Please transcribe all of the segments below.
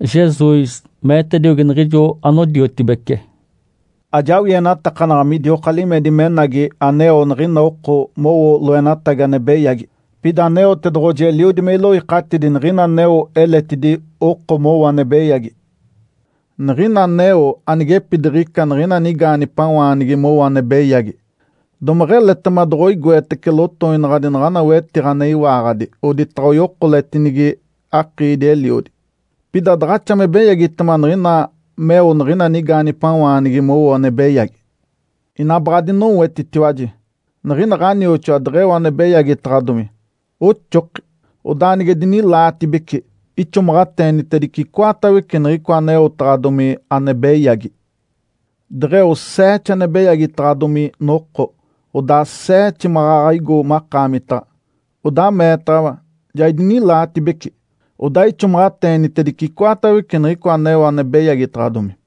Jesus meetediogi niɡ̶ijo anodiotibece, “Ajawienatakanaɡ̶a midioka limedi menagi aneo niɡ̶ina oko mowo loenatagi ane beyagi! Pida Aneotedoɡ̶oji eliodi me iloikatidi niɡ̶ina aneo eletidi oko mowo ane beyagi. Niɡ̶ina aneo anigepidiɡ̶ica niɡ̶ina nigaanigipawaanigi mowo ane beyagi, domeɡ̶eletema doɡ̶oigoetece lotoinaɡ̶adi naɡ̶ana wetiɡ̶a ane iwaaɡ̶adi, oditaɡ̶a oyokoletinigi akiidi-eliodi. Pida daɡ̶axa me beyagitema niɡ̶ina meo niɡ̶ina nigaanigipawaanigi moyoe ane beyagi. Ina baɡ̶a adinoetitiwaji! Niɡ̶ina ɡ̶anioxoa deɡ̶eo ane beyagitaɡ̶adomi, oxoki. Odaa nige dinilaatibece, ixomaɡ̶ateenitedice icoatawece niɡ̶icoa aneotaɡ̶adomi ane beyagi. Deɡ̶eo seete ane beyagitaɡ̶adomi noko, odaa seete maɡ̶aɡ̶a igo makaamitaɡ̶a, odaa meetaɡ̶awa, ‘Ja idinilaatibece’, odaa ixomaɡ̶ateenitedice icoatawece niɡ̶icoa aneo ane beyagitaɡ̶adomi.”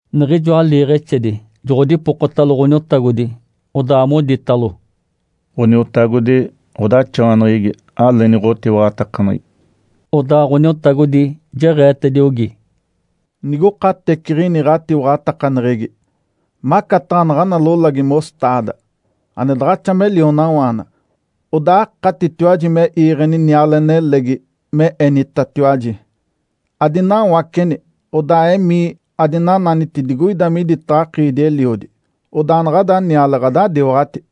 Niɡ̶ijoa liiɡ̶exedi joɡ̶odipokotalo Ǥoniotagodi, odaa moditalo, “Ǥoniotagodi, ɡ̶odaxawaneɡ̶egi aleeni ɡ̶otiwaɡ̶atakaneɡ̶egi.” Odaa Ǥoniotagodi jeɡ̶eetediogi, “Nigokateciɡ̶ini ɡ̶atiwaɡ̶atakaneɡ̶egi, macataɡ̶a naɡ̶ana lolagi ‘mostaada’ ane daɡ̶axa me lionawaana, odaa akatitiwaji me iiɡ̶eni niale nelegi, me enitatiwaji, ‘Adinawaceni, odaa emii adinananiti digoida miditaɡ̶a akiidi-eliodi!’ Odaa naɡ̶ada niale ɡ̶adadiwaɡ̶ati.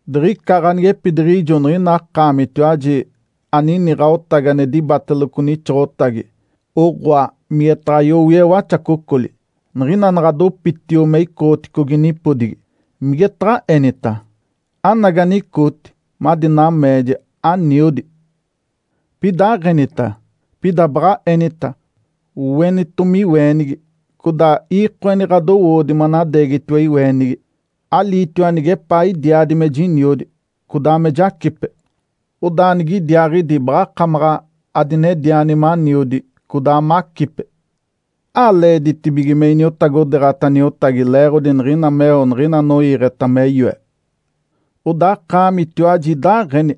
Diɡ̶ica ganigepidiɡ̶ijo niɡ̶ina akaamitiwaji anini ɡ̶aotagi ane dibateloco nixoɡ̶otagi, oɡ̶oa, migetaɡ̶a yowie waxacocoli. Niɡ̶ina naɡ̶a dopitio me icoɡ̶oticogi nipodigi, migetaɡ̶a enita? ‘Anagi, anicooti madi nameeja, aniodi.’ Pida aɡ̶enita! Pida baɡ̶a enita, ‘Oenitomi iweenigi, codaa iikoeni ɡ̶adowoodi manadeegitiwa iweenigi, aliitiwa nigepaa idiaadi me jiniodi, codaa me jacipe. Odaa nigidiaaɡ̶idi baɡ̶akamaɡ̶a adinediani maniodi, codaa macipe.’ Aleeditibige me iniotagodeeɡ̶ata niotagi leeɡ̶odi niɡ̶ina meo niɡ̶ina anoiiɡ̶eta me yoe. Odaa akaamitiwaji idaaɡ̶eni.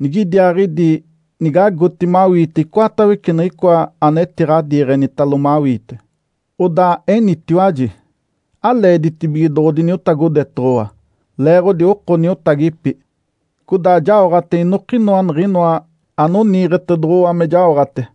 Nigidiaaɡ̶idi nigagoti mawiite icoatawece niɡ̶icoa anetiɡ̶adiiɡ̶enitalo mawiite, odaa enitiwaji, ‘Aleeditibige doɡ̶odiniotagodetoɡ̶owa, leeɡ̶odi oko niotagipi, codaa jaoɡ̶ate inokinoa niɡ̶inoa anoniiɡ̶etedoɡ̶owa me jaoɡ̶ate.’”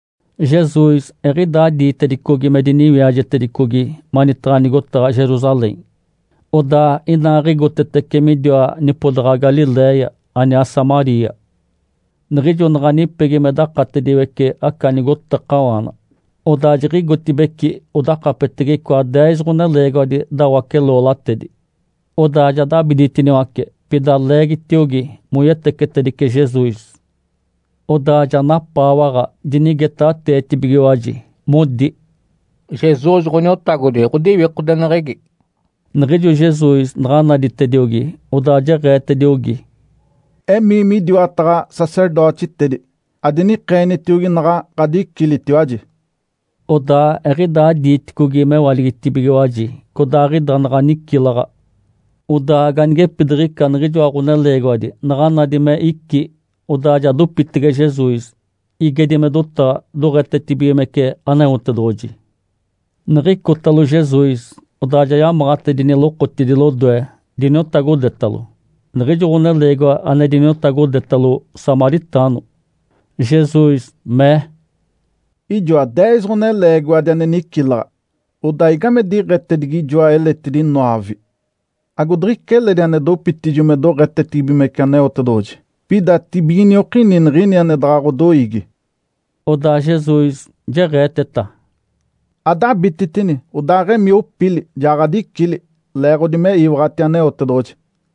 Jesus eɡ̶idaa diitedicogi me diniwiajetedicogi manitaɡ̶a nigotaɡ̶a Jerusalém. Odaa inaaɡ̶igotetece midiwa nipodaɡ̶a Galiléia, aniaa Samaria. Niɡ̶ijo naɡ̶a nipegi me dakatediwece aca nigotakawaana, odaa jiɡ̶igotibeci odakapetege icoa deez ɡ̶oneleegiwadi dawace-loolatedi. Odaa ja dabiditiniwace, pida leegitiogi moyetecetedice Jesus. Odaa ja napaawaɡ̶a dinigetaɡ̶ateetibigiwaji, modi, “Jesus, Ǥoniotagodi, ɡ̶odiwikodeneɡ̶egi!” Niɡ̶ijo Jesus naɡ̶a naditediogi, odaa jeɡ̶eetediogi, “Emii midiwataɡ̶a sacerdotitedi, adinikeenitiogi naɡ̶a ɡ̶adicilitiwaji.” Odaa eɡ̶idaa diiticogi mewaligitibigiwaji, codaaɡ̶ida naɡ̶a nicilaɡ̶a. Odaa ganigepidiɡ̶ica niɡ̶ijoa ɡ̶oneleegiwadi naɡ̶a nadi me icí, odaa ja dopitege Jesus, igedi me dotaɡ̶a, doɡ̶etetibigimece Aneotedoɡ̶oji. Niɡ̶icotalo Jesus, odaa ja yamaɡ̶atedini lokotidi lodoe, diniotagodetalo. Niɡ̶ijo ɡ̶oneleegiwa ane diniotagodetalo, samaritaano. Jesus mee, “Ijoa deez ɡ̶oneleegiwadi ane nicilaɡ̶a. Odaa igame diɡ̶etedigi ijoa eletidi noove? Agodiɡ̶ica eledi ane dopitijo me doɡ̶etetibigimece Aneotedoɡ̶oji, pida tibiginiokini niɡ̶ini ane daɡ̶a ɡ̶odoiigi?” Odaa Jesus jeɡ̶eeteta, “Adabititini, odaaɡ̶emii opili! Ja ɡ̶adicili, leeɡ̶odi me iwaɡ̶ati Aneotedoɡ̶oji.”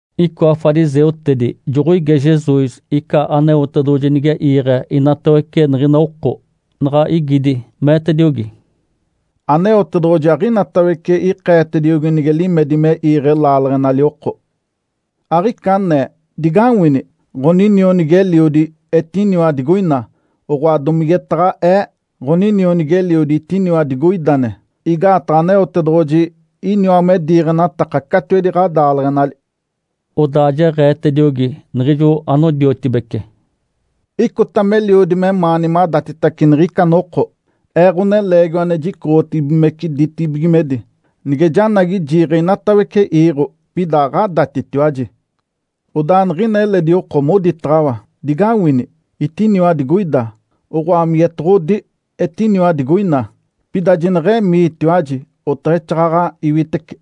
Icoa fariseutedi joɡ̶oige Jesus ica Aneotedoɡ̶oji nige iiɡ̶e inatawece niɡ̶ina oko. Naɡ̶a igidi, meetediogi, “Aneotedoɡ̶oji aɡ̶inatawece ikeetediogi nige limedi me iiɡ̶e laaleɡ̶enali oko. Aɡ̶ica anee, ‘Digawini! Ǥoninionigi-eliodi etiniwa digoina!’ Oɡ̶oa, domigetaɡ̶a ee, ‘Ǥoninionigi-eliodi etiniwa digoidane!’ Igaataɡ̶a Aneotedoɡ̶oji iniwa me diiɡ̶enataka catiwedi ɡ̶adaaleɡ̶enali.” Odaa jeɡ̶eetediogi niɡ̶ijo anodiotibece, “Icota meliodi memaani madatitace niɡ̶ica noko Ee, Ǥoneleegiwa ane jicoɡ̶otibigimece ditibigimedi, nige janagi jiiɡ̶e inatawece iiɡ̶o, pida aɡ̶adatitiwaji. Odaa niɡ̶ina eledi oko moditaɡ̶awa, ‘Digawini! Etiniwa digoida!’ Oɡ̶oa, migetoɡ̶odi, ‘Etiniwa digoina!’ Pida jineɡ̶emiitiwaji, oteɡ̶exaaɡ̶aɡ̶a iwitece.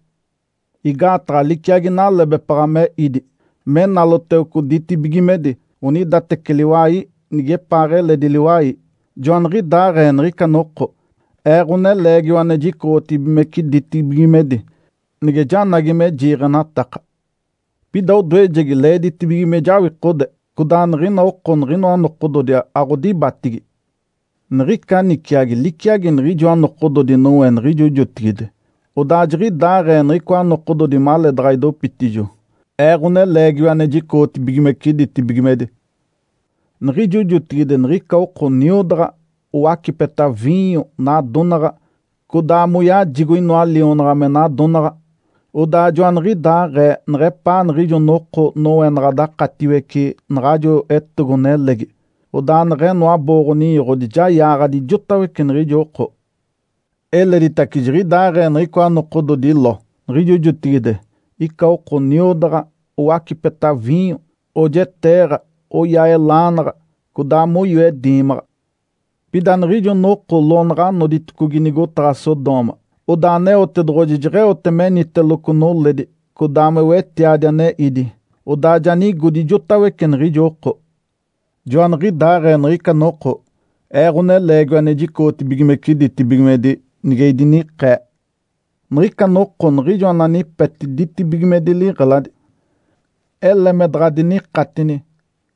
Igaataɡ̶a liciagi nalebepaɡ̶a me ídi, me naloteloco ditibigimedi onidateci liwai nigepaaɡ̶eledi liwai, joaniɡ̶idaaɡ̶ee niɡ̶ica noko Ee, Ǥoneleegiwa ane jicoɡ̶otibigimece ditibigimedi, nige janagi me jiiɡ̶enataka. Pida odoejegi, leeditibige me jawikode, codaa niɡ̶ina oko niɡ̶inoa nokododi aɡ̶odibatigi. Niɡ̶ica niciagi liciagi niɡ̶ijoa nokododi Noé, niɡ̶ijo jotigide, odaa jiɡ̶idaaɡ̶ee niɡ̶icoa nokododi maleedaɡ̶a idopitijo Ee, Ǥoneleegiwa ane jicoɡ̶otibigimece ditibigimedi. Niɡ̶ijo jotigide niɡ̶ica oko niodaɡ̶a, owacipeta viinyo, nadonaɡ̶a, codaa moyajigo inoa lionaɡ̶a me nadonaɡ̶a. Odaa joaniɡ̶idaaɡ̶ee neɡ̶epaa niɡ̶ijo noko Noé naɡ̶a dakatiwece naɡ̶ajo etogo-nelegi. Odaa neɡ̶eno abooɡ̶o-ninyoɡ̶odi, ja yaaɡ̶adi ijotawece niɡ̶ijo oko. Eleditace jiɡ̶idaaɡ̶ee niɡ̶icoa nokododi Ló, niɡ̶ijo jotigide. Ica oko niodaɡ̶a, owacipeta viinyo, oojeteeɡ̶a, oyaa elaanaɡ̶a, codaa moyoe diimaɡ̶a. Pida niɡ̶ijo noko Ló naɡ̶a noditicogi nigotaɡ̶a Sodoma, odaa Aneotedoɡ̶oji jeɡ̶eote meniteloco noledi, codaa me wetiadi ane ídi, odaa ja nigodi ijotawece niɡ̶ijo oko. Joaniɡ̶idaaɡ̶ee niɡ̶ica noko Ee, Ǥoneleegiwa ane jicoɡ̶otibigimece ditibigimedi, nige idinikee. Niɡ̶ica noko, niɡ̶ijo ananipeti ditibigimedi liɡ̶eladi, ele me daɡ̶a dinikatini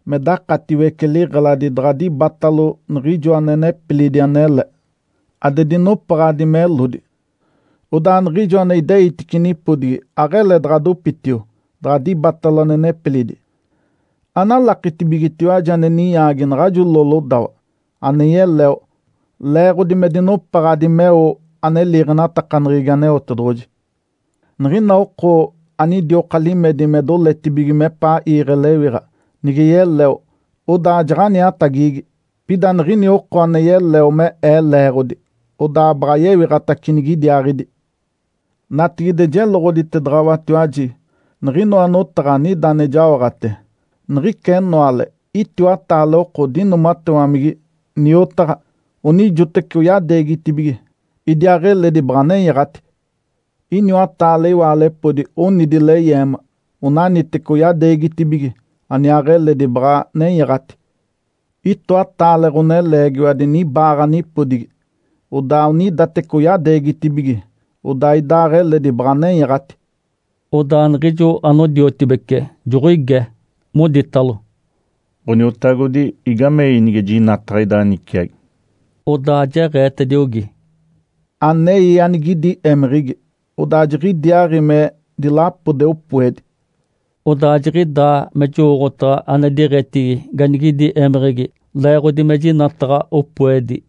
me dakatiwece liɡ̶eladi daɡ̶a dibatalo niɡ̶ijo ane nepilidi anele, ade dinopaɡ̶adi melodi. Odaa niɡ̶ijo ane ideitice nipodigi aɡ̶ele daɡ̶a dopitio daɡ̶a dibatalo ane nepilidi. Analakitibigetiwaji ane ninyaagi naɡ̶ajo Ló lodawa! (Ane yeleo, leeɡ̶odi me dinopaɡ̶adi meo ane liiɡ̶enatakaneɡ̶egi Aneotedoɡ̶oji). Niɡ̶ina oko anidioka limedi me doletibige mepaa iiɡ̶e lewiɡ̶a, nige yeleo, odaa jaɡ̶aniatagigi. Pida niɡ̶ina oko ane yeleo me Ee leeɡ̶odi, odaa baɡ̶a yewiɡ̶atace nigidiaaɡ̶idi. Natigide jeloɡ̶oditedaɡ̶awatiwaji niɡ̶inoa notaɡ̶a anida ane jaoɡ̶ate. Niɡ̶ica enoale itiwataale oko dinoomatewamigi, niotaɡ̶a. Onijoteci oyadeegitibigi, idiaaɡ̶eledi baɡ̶a nenyaɡ̶ati. Iniwataale iwaalepodi onidi leyeema. Onaniteci oyadeegitibigi, aniaaɡ̶eledi baɡ̶a nenyaɡ̶ati. Itoataale ɡ̶oneleegiwadi nibaaɡ̶a nipodigi. Odaa onidateci oyadeegitibigi, odaa idaaɡ̶eledi baɡ̶a nenyaɡ̶ati.” Odaa niɡ̶ijo anodiotibece joɡ̶oige, moditalo, “Ǥoniotagodi, igamei nige jinataɡ̶a ida niciagi?” Odaa jeɡ̶eetediogi, “Anei anigidi émeɡ̶egi, odaa jiɡ̶idiaaɡ̶i me dilapode opoedi.” (Odaa jiɡ̶idaa me jowooɡ̶otaɡ̶a ane diɡ̶etigi ganigidi émeɡ̶egi, leeɡ̶odi me jinataɡ̶a opoedi).